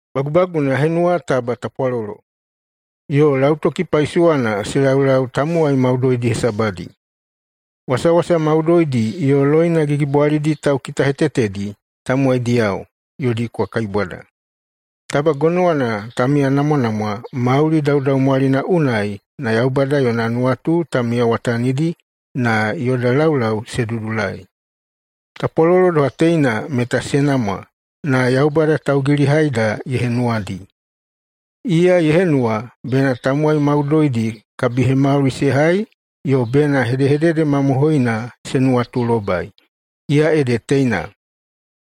Bagubaguna ya henuwa taba tapwalolo yo lautoki paisowana se laulau tamowai maudoidi hesabadi. Wasawasa maudoidi yo loina gigibwalidi taukitahetetedi tamowaidiyao yodi kwa kaibwada, taba gonowana ta miyanamwanamwa mauli daudaumwalina unai na Yaubada yona nuwatu ta miyawatanidi na yoda laulau se dudulai. Tapwalolo doha teina meta se namwa na Yaubada taugilihaida ye henuwadi. Iya ye henuwa bena tamowai maudoidi kabihemauli se hai yo bena hedehedede mamohoina se nuwatulobai, iya ede teina: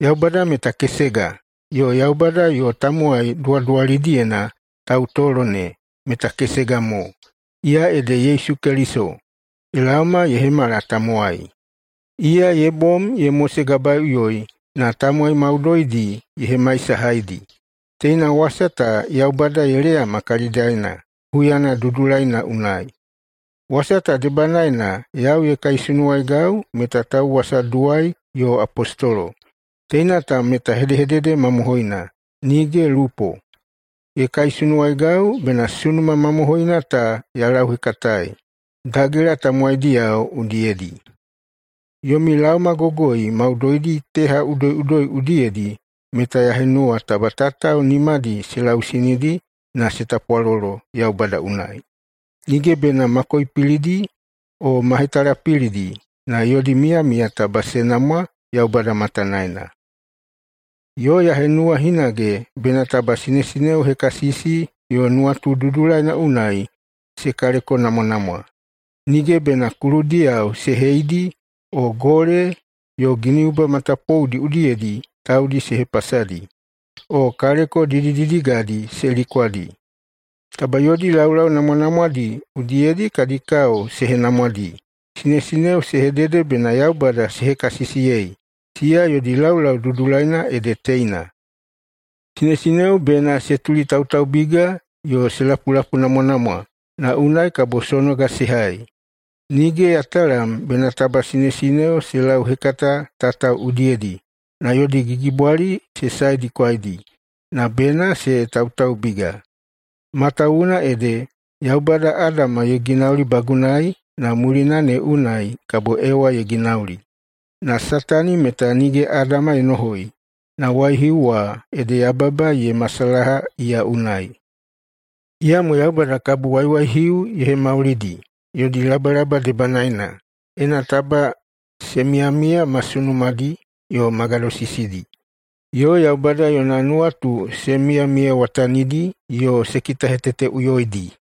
Yaubada meta kesega, yo Yaubada yo tamowai duwaduwalidiyena tautolo ne meta kesega mo, iya ede Yesu Keliso, ye laoma ye hemala tamowai. Iya ye bom ye mosegabaeiꞌuyoi na tamowai maudoidi ye hemaisahaidi. Teina wasa ta Yaubada ye leyama kalidaena huyana dudulaina unai. Wasa ta debanaena yau ye kaisunuwaigau meta tauwasaduwai yo apostolo – teina ta meta hedehedede mamohoina, nige lupo. Ye kaisunuwaigau bena sunuma mamohoina ta ya lauhekataei dagela tamowaidiyao udiyedi. Yomi laomagogoi maudoidi teha udoiꞌudoi udiyedi meta ya henuwa taba tatao nimadi se lausinidi na se tapwalolo Yaubada unai, nige bena ma koipilidi o ma hetalapilidi, na yodi miyamiya taba se namwa Yaubada matanaena. Yo ya henuwa hinage bena taba sinesineo hekasisi yo nuwatu dudulaina unai se kalekonamwanamwa. Nige bena kuludiyao se heidi, o gole yo giniuba matapouna udiyedi taudi se hepasadi, o kaleko didididigadi se likwadi. Taba yodi laulau namwanamwadi udiyedi kadi kao se henamwadi. Sinesineo se hedede bena Yaubada se hekasisiyei, siya yodi laulau dudulaina ede teina. Sinesineo bena se tulitautaubiga yo se lapulapuinamwanamwa na unai kabo sonoga se hai. Nige ya talam bena taba sinesineo se lauhekata tatao udiyedi na yodi gigibwali se saedikwaidi, na bena se tautaubiga. Matawuwuna ede Yaubada Adama ye ginaulibagunai na mulina ne unai kabo Ewa ye ginauli. Na Satani meta nige Adama ye nohoi, na waihiu wa, ede yababa ye masalaha iya unai. Iyamo Yaubada kabo waiwaihiu ye hemaulidi yodi labalaba debanaena, ena taba se miyamiya ma sunumadi yo ma gadosisidi, yo Yaubada yona nuwatu se miyamiyawatanidi, yo se kitaheteteꞌuyoidi.